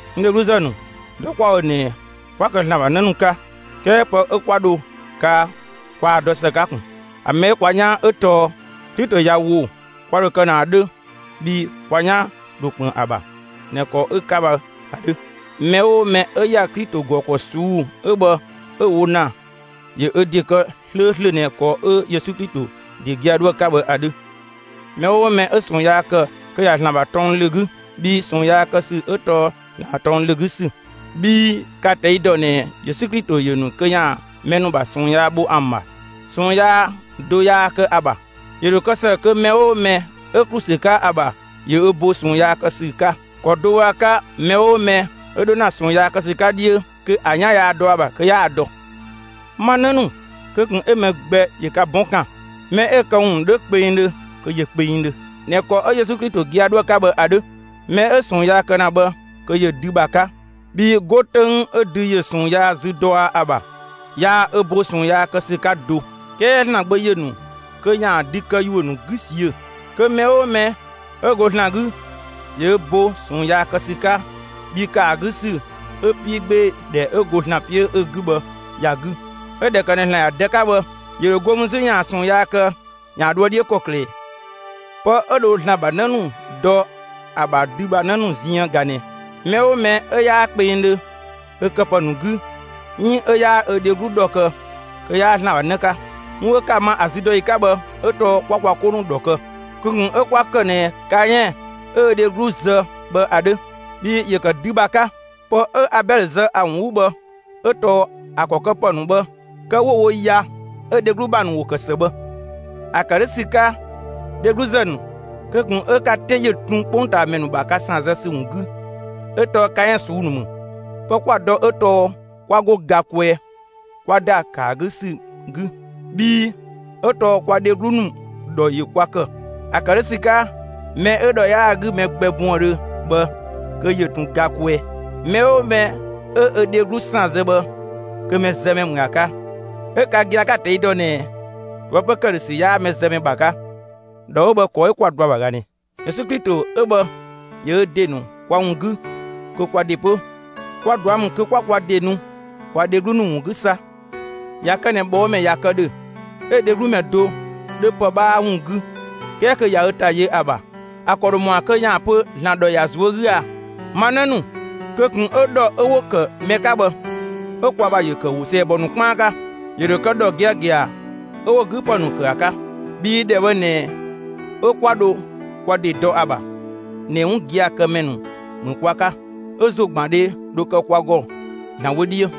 N dhegluzë ‑nu, dɔ 'kwa‑ wo ꞊nɛ, 'kwa kë ‑Zlan ‑bha 'në ‑nu 'ka. 'Kɛɛ pë 'ö 'kwa dho kaa kwaa‑ dɔ ‑së 'ka ꞊kun. ‑A mɛ 'ö kwa 'yaan 'ö tɔɔ: Klito ꞊ya ‑wo, kwa ‑dho kë ꞊nɛ ‑a 'dhö bhii kwa 'yan ‑dho ‑kpën ‑a ‑bha ꞊nɛ ‑kɔ 'ö‑ 'ka bhë ‑a 'dhö. Mɛ 'oo mɛ 'ö ‑ya Klito ‑gɔ ‑kɔ ꞊suu'‑ 'ö bhë 'ö‑ wo ‑na ‑yö ö ‑de ‑kë 'slööslö ꞊nɛ ‑kɔ 'ö Yesu Klito ‑de gia‑ 'dhoë‑ 'ka bhë ‑a 'dhö. Mɛ 'oo mɛ 'ö ꞊sɔɔn yaa ‑kë kö ꞊ya ‑Zlan ‑bha tɔng ‑lö 'gü, bhii ꞊sɔɔn yaa kë ‑sü 'ö tɔɔ ‑Zlan ‑bha tɔng ‑lö 'gü ‑sü. Bhii ka‑ ꞊tɛi' ‑dɔ ꞊nɛ Yesu Klito ‑yö ‑nu kö ‑yaan mɛ ‑nu ‑bha ꞊sɔɔn yaa bho ‑an ‑bha; ꞊sɔɔn yaa do yaa kë ‑a ‑bha. ‑Yö ‑dho kë ‑së kö mɛ 'oo mɛ 'ö ‑klu ‑sü 'ka ‑a ‑bha, ‑yö ö bo ꞊sɔɔn yaa kë ‑sü 'ka. ‑Kɔ do bhë ‑a 'ka mɛ 'oo mɛ 'ö 'dho ‑na ꞊sɔɔn yaa kë ‑sü 'ka 'dhiö, kö ‑a 'yan yaa dɔ ‑a ‑bha; kö 'yaa‑ dɔ. Ma 'në ‑nu, kö ꞊kun 'ö mɛ gbɛ ‑yö ka 'bɔn ‑kan. Mɛ 'ö‑ këwun ‑nu 'dho kpengdhö, kö ‑yö kpengdhö ꞊nɛ ‑kɔ 'ö Yesu Klito gia‑ 'dhoë‑ 'ka bhë ‑a 'dhö. Mɛ 'ö ꞊sɔɔn yaa kë ‑na bhë kö ‑yö dü ‑bha 'ka; bhii 'go 'töng 'ö dü ‑yö ꞊sɔɔn yaa zü dɔa ‑a ‑bha, yaa ö bo ꞊sɔɔn yaa kë ‑sü 'ka do. 'Kɛɛ ‑Zlan Gbö ‑yö ‑nu kö ‑yaan dü këyuö ‑nu 'gü ꞊siö'‑. Kö mɛ 'oo mɛ 'ö go ‑Zlan 'gü ‑yö ö ‑bo ꞊sɔɔn yaa kë ‑sü 'ka bhii ‑kë ‑a 'gü ‑sü 'ö 'piigbeedhɛ 'ö go ‑Zlan 'piö 'ö 'gü bhë ‑ya 'gü; 'ö ꞊dhɛ ‑kë ꞊nɛ ‑Zlan ‑ya Dë 'ka bhë, ‑yö ‑dho go mü 'zü ‑yaan ꞊sɔɔn yaa kë ‑yaan dhoë 'dhiö ‑kɔklë ꞊ɛ? Pë 'ö dho ‑Zlan ‑bha 'në ‑nu dɔ ‑a ‑bha dü ‑bha 'në ‑nu ziën ꞊ga ꞊nɛ: Mɛ 'oo mɛ 'ö 'yaa kpengdhö ö këpë ‑nu 'gü 'iin 'ö 'yaa ö dheglu ‑dhɔ kë kö 'yaa ‑Zlan ‑bha 'në 'ka. 'Wun 'ö 'ka‑ ma ‑a züdɔyi 'ka bhë 'ö tɔɔ 'kwa kwa 'ko ‑nu ‑dhɔ kë. Kö ꞊kun 'ö 'kwa ‑kë ꞊nɛ Kaɛn 'ö ö dheglu zë bhë ‑a 'dhö; bhii ‑yö ‑kë dü ‑bha 'ka. Pë 'ö Abɛlö zë ‑a ‑wun 'gü bhë 'ö tɔɔ ‑a ‑kɔ këpë ‑nu bhë kë 'wo‑ wo ya 'ö‑ dheglu ‑bha ‑nu ‑wo kë ‑së bhë. ‑A ‑kë 'dhö ‑sü 'ka, dhegluzë ‑nu, kö ꞊kun 'ö ka 'te ‑yö tun 'kpongtaamɛ ‑nu ‑bha ka ‑san zë ‑sü ‑wun 'gü ('ö tɔɔ Kaɛn ꞊suu'‑ ‑nu ‑mü)! Pë 'kwa‑ dɔ 'ö tɔɔ 'kwa 'go ga kwɛɛ 'kwa ‑da ‑kë ‑a 'gü ‑sü 'gü; bhii 'ö tɔɔ kwa dheglu ‑nu ‑dhɔ ‑yö kwa ‑kë. ‑A ‑kë 'dhö ‑sü 'ka mɛ 'ö ‑dhɔ 'yaa‑ 'gü mɛ gbɛ buëndhö bhë kö ‑yö ꞊tun ga kwɛɛ. Mɛ 'oo mɛ 'ö ö dheglu ‑san zë bhë kö mɛzëmɛ ‑mü ‑a 'ka; 'ö ka gia‑ 'ka‑ ꞊tɛi' dɔ ꞊nɛ ꞊toëpö ‑këdhösü 'yaa mɛzëmɛ ‑bha 'ka. ‑Dhɔ 'ö bhë ‑kɔ 'ö 'kwa‑ dɔ ‑a ‑bha ꞊ga ꞊nɛ: Yesu Klito 'ö bhë ‑yö ö ‑de ‑nu kwa ‑wun 'gü; kö kwa ‑de 'pö, kwa ꞊dua' ‑mü kö 'kwa kwa ‑de nu kwa dheglu ‑nu ‑wun 'gü 'sa. ꞊Ya kë ꞊nɛ ꞊bhɔɔmɛ ꞊ya kë ‑dhö, 'ö‑ dheglu ‑mɛ do 'dhö pë 'bhaa ‑wun 'gü 'kɛɛ kö ꞊ya ö ‑ta yö ‑a ‑bha, ‑a ‑kɔ ‑dho ‑mɔa kö ‑yaan pö ‑Zlan ‑dhɔ ‑ya ꞊zuö' 'gü aa? Ma 'në ‑nu, kö ꞊kun 'ö ‑dhɔ 'ö 'wo‑ ‑kë mɛ 'ka bhë 'ö kwa ‑bha ‑yö ‑kë ‑wo ‑sɛɛbɔ ‑nu 'kpaan 'ka. ‑Yö ‑dho kë ‑dhɔ giagia 'ö 'wo‑ 'gü ‑pë ‑nu ‑kë ‑a 'ka. Bhii ‑dhɛ bhë ꞊nɛ 'ö 'kwa dho kwa ‑de dɔ ‑a ‑bha ꞊nɛ 'wun gia‑ kë ‑mɛ ‑nu ‑mü kwa 'ka 'ö ‑zogbandhe dho kë kwa ‑gɔ ‑Zlan wö 'dhiö.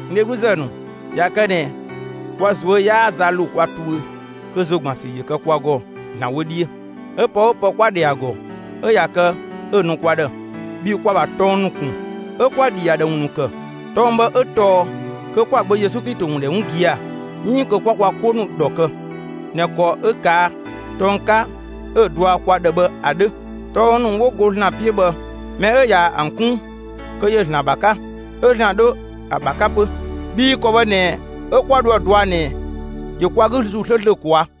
N dhegluzë ‑nu, ꞊ya kë ꞊nɛ kwa ꞊zuö' 'yaa za ‑lo kwa tuö, kö ‑zo ‑gban ‑sü ‑yö kwa ‑gɔ ‑Zlan wö 'dhiö. 'Ö pë 'oo pë 'kwa‑ ‑dhɛ ‑a ‑gɔ 'ö ꞊ya kë 'ö‑ nu kwa ‑dhë bhii kwa‑ ‑bha tɔng ‑nu ‑kun 'ö 'kwa‑ ‑dhi ‑a ‑dhë ‑wun ‑nu ‑kë. Tɔng bhë 'ö tɔɔ: Kö 'kwa‑ Gbö Yesu Klito ‑wun ‑dhɛ 'wun gia‑ 'iin kö 'kwa kwa 'ko ‑nu ‑dhɔ kë ꞊nɛ ‑kɔ 'ö‑ ꞊kaa' tɔng 'ka 'ö‑ dɔa kwa ‑dhë bhë ‑a 'dhö. Tɔng ‑nu 'wo go ‑Zlan 'piö bhë, mɛ 'ö ꞊ya ‑an 'kun, kö ‑yö ‑Zlan ‑bha 'ka, 'ö ‑Zlan 'dhö ‑a ‑bha 'ka 'pö. Bhii ‑kɔ bhë ꞊nɛ 'ö 'kwa dho ‑a dɔa ꞊nɛ ‑yö kwa 'gü ‑Zuu 'slööslö ꞊kwaa'.